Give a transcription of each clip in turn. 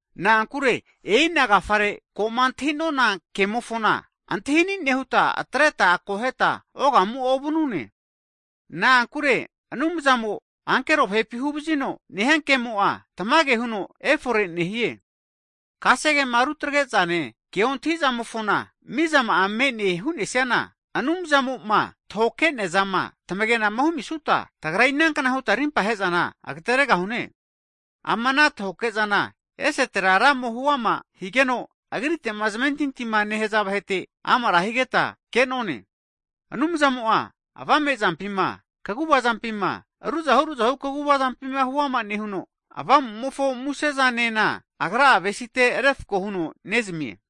Na'ankure e'ina agafare ko'ma antahi'nona kemofona antahini' nehuta atreta akoheta ogamu'a ovanune. Na'ankure Anumzamo ankero vahepi huvazino nehia ke'mo'a, tamage huno efore nehie. Kasegema rutagrezane ke ontahizamofona, mizama'a me'ne hunesiana, Anumzamo'ma tahoke'neazama tamagenama humisuta, tagra inankna huta rimpa hezana agateregahune? Ama ana tahoke'zana esetera Ramo hu'ama higeno, Agrite'ma zamentintima nehaza vahete amara higeta ke'none. Anumzamo'a avamezampima, kaguvazampima, ruzahu ruzahu kaguvazampi huama nehuno, Avamumofo musezanena Agra'a avesite refko huno nezamie.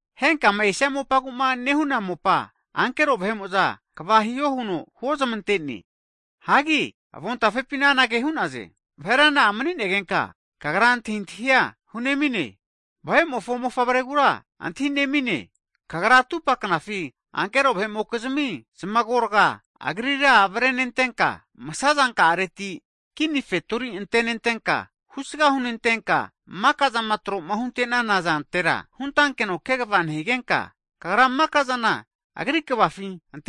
Henkama esia mopaguma nehuna mopa, ankero vahe'mo'za kva hiho huno huozamante'ne. Hagi avontafepina anage hu'naze. Vahera na'a mni'negenka kagra antahintahia hunemine? Vahe'mofo mofavregura antahinemine? Kagra atupa knafi ankero vahe'mokizmi zamagorga Agrira avrenentenka, msazanka'areti kini fetori antenentenka, husga hunentenka, makazama tro'ma huntenana zantera huntankeno kegva nehigenka, Kagra makazana Agri kvafi ante'nane.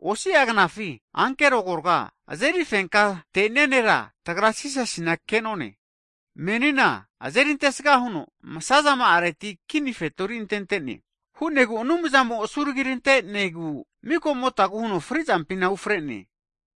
Osia knafi ankero agorga azeri fenkate'nea nera tagra Jisasina kenone, menina azeri antesga huno msazama'areti kini fetori antente'ne. Hu'negu Anumzamo asuragirantenegu mikamotagu huno frizampina ufrene.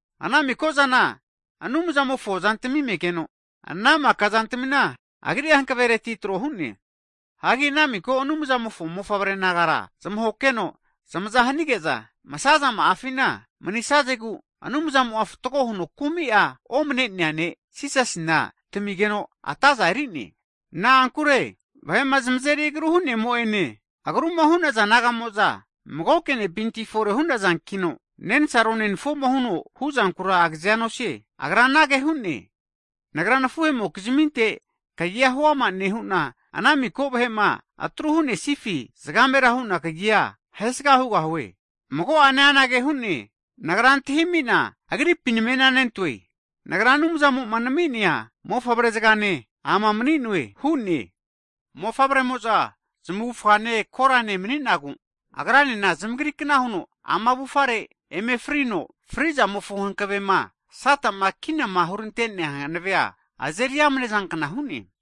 Ana miko'zana Anumzamofo zantami megeno, ana maka zantamina Agri'a hankavereti trohune. Hagi ana miko Anumzamofo mofavre nagara zamahokeno zamaza hanige'za masazama'afina manisazegu Anumzamo'a fatgo huno kumi'a omanenea Ne' Jisasina tamigeno atazana eri'ne. Na'ankure vahe'ma zamazeri agru hu'nemo'ene, agruma hu'naza nagamo'za, magoke ne'pinti fore hu'nazankino, nensaro nenafuo huno huzankura agazea nosie. Agra anage hu'ne, Nagra nafuhemokizaminte kagia huama nehuna, ana miko vahe'ma atru hunesifi, zgamera huna kagika'a ahesaga hugahue. Mago'ane anage hu'ne, Nagra antahimina agripi namenanentoe, Nagra Anumzamo'ma nami'nea mofavre zgane ama mani'noe hu'ne. Mofavre'mo'za zamavufgane korane mani'nagu, Agranena zamagrikna huno ama avufare eme frino, fri'zamofo hankavema sata'ma kinama hurante'nea hanavea azeri amnezankna hu'ne.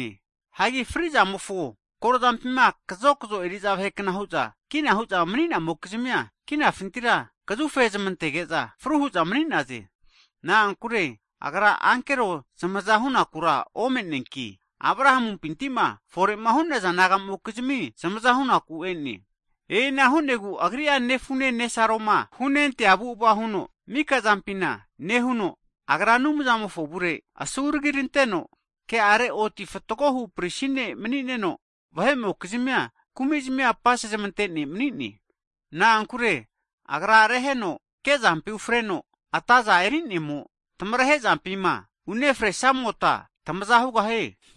Hagi fri'zamofo korozampima kazokzo eri'za vahekna hu'za kina hu'za mani'namokizmia kazufe zmantege'za fruhu'za mani'naze. Na'ankure Agra ankero zmaza hu'nakura ome'neanki, Abrahamumpintima fore'ma hu'naza nagamokizmi zmaza hu'naku e'ne. E'ina hu'negu Agri'a nefune nesaroma hunentea avu'ava huno mika'zampina nehuno, Agra Anumzamofo avurera asuragiranteno ke'are oti fatgohu prisi ne' nemanino, vahe'mokizmia kumizmi nona huno magoke zupa apasezmante ne' mani'ne. Na'ankure Agra reheno kezampi ufreno ataza eri'nemo, tamarehe zampima unefrazamota tamaza hugahie.